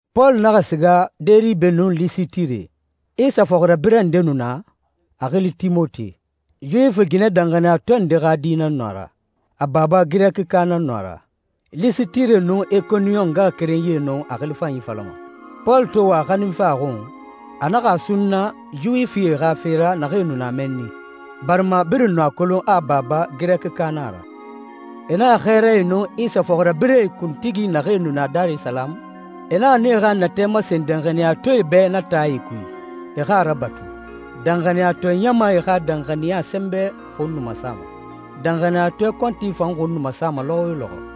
Pɔlu naxa siga Deribe nun Lisitire. Isa fɔxirabirɛ nde nu na, a xili Timote. Yuwifi ginɛ danxaniyatɔɛ nde xa di nan nu a ra. A baba Girɛkika nan nu a ra. Lisitire nun Ikoniyon ngaxakerenyie nu a xili fanyi falama. Pɔlu to wa a xaninfe a xun, a naxa a sunna Yuwifie xa fe ra naxee nu na mɛnni, barima birin nu a kolon a baba Girɛkika na a ra. E naxa xɛɛrae nun Isa fɔxirabirɛe kuntigi naxee nu na Darisalamu, e naxa nee xa natɛ masen danxaniyatɔɛe bɛ na taae kui, e xa a rabatu. Danxaniyatɔɛ ɲamae xa danxaniya sɛnbɛ xun nu masama, danxaniyatɔɛ kɔnti fan xun nu masa lɔxɔ yo lɔxɔ.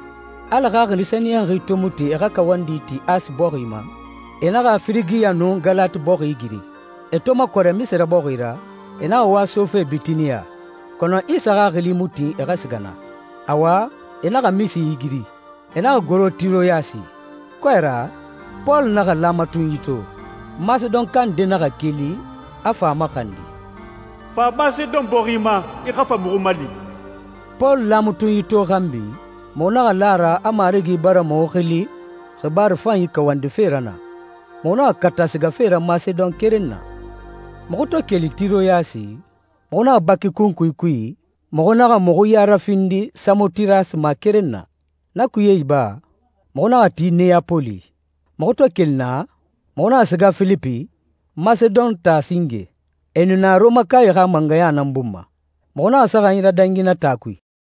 Ala Xaxili Sɛniyɛnxi to mu tin e xa kawandi ti Asi bɔxi ma, e naxa Firigiya nun Galati bɔxi igiri. E to makɔrɛ Misi bɔxi ra, e naxa wa sofe Bitiniya, kɔnɔ Isa Xaxili mu tin e xa siga naa. Awa, e naxa Misi igiri, e naxa goro Tiroyasi. Kɔɛ ra, Pɔlu naxa laamatunyi to. Masedonka nde naxa keli, a fa a maxandi, «Fa Masedon bɔxi ma, i xa fa muxu mali.» Pɔlu laamatunyi to xanbi, muxu naxa la a ra a Marigi bara muxu xili xibaaru fanyi kawandife ra naa. Muxu naxa kata sigafe ra Masedon keren na. Muxu to keli Tiroyasi, muxu naxa baki kunkui kui, muxu naxa muxu ya rafindi Samotirasi ma keren na. Na kuye iba, muxu naxa ti Neyapoli. Muxu to keli naa, muxu naxa siga Filipi, Masedon taa singe. E nu na Rɔmakae xa mangɛya nan bun ma. Muxu naxa saxanyi radangi na taa kui.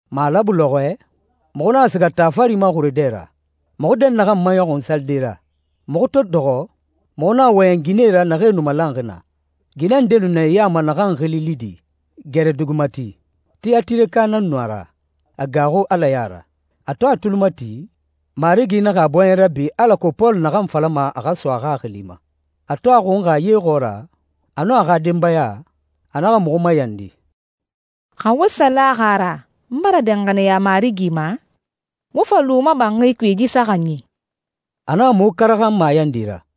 Malabu lɔxɔɛ, muxu naxa siga taa fari ma xure dɛ ra, muxu dɛnnaxɛ maɲɔxun salide ra. Muxu to dɔxɔ, muxu naxa wɔyɛn ginɛe ra naxee nu malanxi naa. Ginɛ nde nu na e ya ma naxan xili Lidi, garɛ dugi mati. Tiyatireka nan nu a ra. A gaaxu Ala ya ra. A to a tuli mati, Marigi naxa a bɔɲɛ rabi alako Pɔlu naxan falama a xa so a xaxili ma. A to a xunxa ye xɔɔra, a nun a xa denbaya, a naxa muxu mayandi, «Xa wo sa laxi a ra n bara danxaniya Marigi ma, wo fa lu n ma banxi kui yi saxanyi.» A naxa muxu karaxan mayandi ra.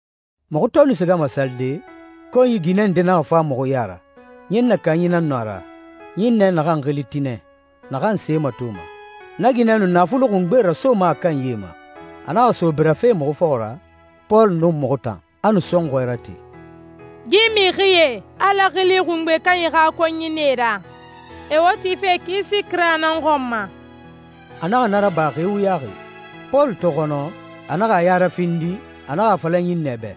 Muxu to nu sigama salide, konyi ginɛ nde naxa fa muxu ya ra. Ɲinnɛ kanyi nan nu a ra, ɲinnɛ naxan xili Tinɛ, naxan se matoma. Na ginɛ nu naafuli xungbe rasoma a kanyie ma. A naxa so birafe muxu fɔxɔ ra, Pɔlu nun muxu tan. A nu sɔnxɔɛ rate, «Yi mixie Ala Xili Xungbe Kanyi xa konyie nan e ra. E wo tife kisi kira nan xɔn ma.» A naxa na raba xi wuyaxi. Pɔlu to xɔnɔ, a naxa a ya rafindi, a naxa a fala ɲinnɛ bɛ,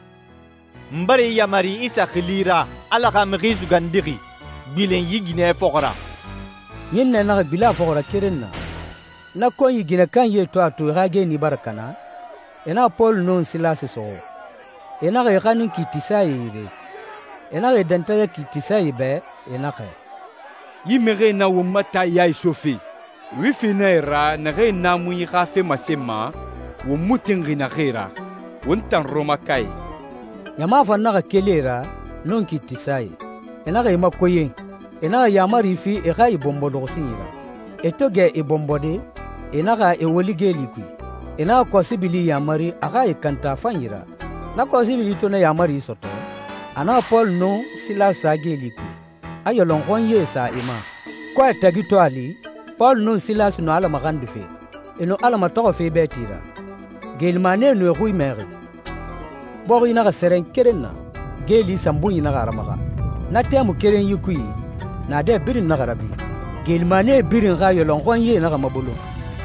«N bara i yamari Isa xili ra, Ala xa Mixi Sugandixi, gbilen yi ginɛ fɔxɔ ra.» Ɲinnɛ naxa gbilen a fɔxɔ ra keren na. Na konyi ginɛ kanyie to a to e xa geeni bara kana, e naxa Pɔlu nun Silasi suxu. E naxa e xanin kiitisae yire. E naxa e dɛntɛgɛ kiitisae bɛ, e naxɛ, «Yi mixie nan won ma taa ya isofe. Yuwifi nan e ra naxee naamunyie xa fe masenma won mu tinxi naxee ra, won tan Rɔmakae.» Ɲama fan naxa keli e ra, nun kiitisae. E naxa e makoyɛn, e naxa yaamari fi e xa e bɔnbɔ luxusinyi ra. E to gɛ e bɔnbɔde, e naxa e woli geeli kui. E naxa kɔsibili yamari a xa e kanta a fanyi ra. Na kɔsibili to na yaamari sɔtɔ, a naxa Pɔlu nun Silasi sa geeli kui, a yɔlɔnxɔnyie sa e ma. Kɔɛ tagi to a li, Pɔlu nun Silasi nu Ala maxandife, e nu Ala matɔxɔfe bɛɛti ra. Geelimanie nu e xui mɛxi. Bɔxi naxa sɛrɛn keren na, geeli sanbunyi naxa a ramaxa. Na tɛmui kerenyi kui, naadɛ birin naxa rabi. Geelimanie birin xa yɔlɔnxɔnyie naxa mabolon.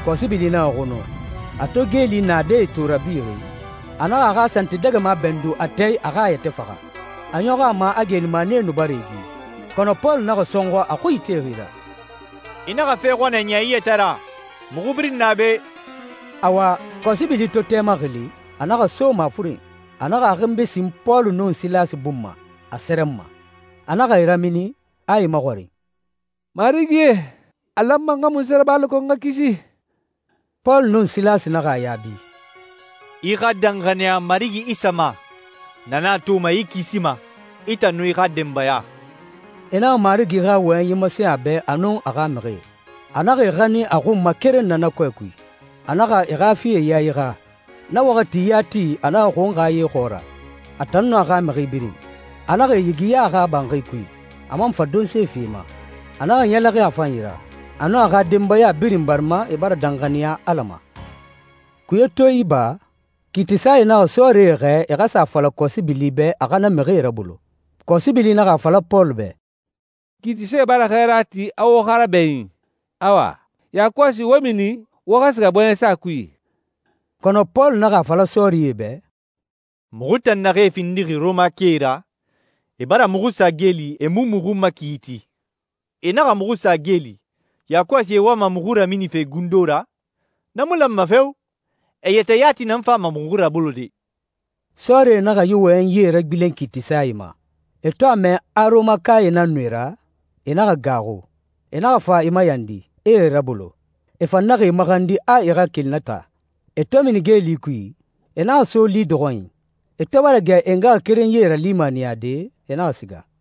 Kɔsibili naxa xunu. A to geeli naadɛe to e rabixi, a naxa a xa santidɛgɛma bɛndun a tɛɛ a xa a yɛtɛ faxa, a ɲɔxɔ a ma a geelimanie nu bara e gi. Kɔnɔ Pɔlu naxa sɔnxɔ a xui itexi ra, «I naxa fe xɔnɛ niya i yɛtɛ ra, muxu birin na be.» Awa, kɔsibili to tɛ maxili, a naxa so mafuren. A naxa a xinbi sin Pɔlu nun Silasi bun ma, a sɛrɛnma. A naxa e ramini, a e maxɔrin, «Marigie, a lanma n xa munse raba alako n xa kisi?» Pɔlu nun Silasi naxa a yaabi, «I xa danxaniya Marigi Isa ma. Na nan a toma i kisima, i tan nun i xa denbaya.» E naxa Marigi xa wɔyɛnyi masen a bɛ a nun a xa mixie. A naxa e xanin a xun ma keren na kɔɛ kui, a naxa e xa fie yae xa. Na waxati yati a naxa xunxa ye xɔɔra, a tan nun a xa mixi birin. A naxa e yigiya a xa banxi kui, a man fa donse fi e ma. A naxa ɲɛlɛxin a fanyi ra, a nun a xa denbaya birin barima e bara danxaniya Ala ma. Kuye to iba, kiitisae naxa sɔɔrie xɛɛ e xa sa a fala kɔsibili bɛ a xa na mixie rabolo. Kɔsibili naxa a fala Pɔlu bɛ, «Kiitisae bara xɛɛra ti a wo xa rabɛɲin. Awa, yakɔsi wo mini, wo xa siga bɔɲɛsa kui.» Kɔnɔ Pɔlu naxa a fala sɔɔrie bɛ, «Muxu tan naxee findixi Rɔmakae ra, e bara muxu sa geeli e mu muxu makiiti. E naxa muxu sa geeli, yakɔsi e wama muxu raminife gundo ra? Na mu lanma feo! E yɛtɛ yati nan fama muxu rabolode.» Sɔɔrie naxa yi wɔyɛnyie ragbilen kiitisae ma. E to a mɛ a Rɔmakae nan e ra, e naxa gaaxu. E naxa fa e mayandi, e e rabolo. E fan naxa e maxandi a e xa keli na taa. E to mini geeli kui, e naxa so Lidi xɔnyi. E to bara gɛ e ngaxakerenyie ralimaniyade, e naxa siga.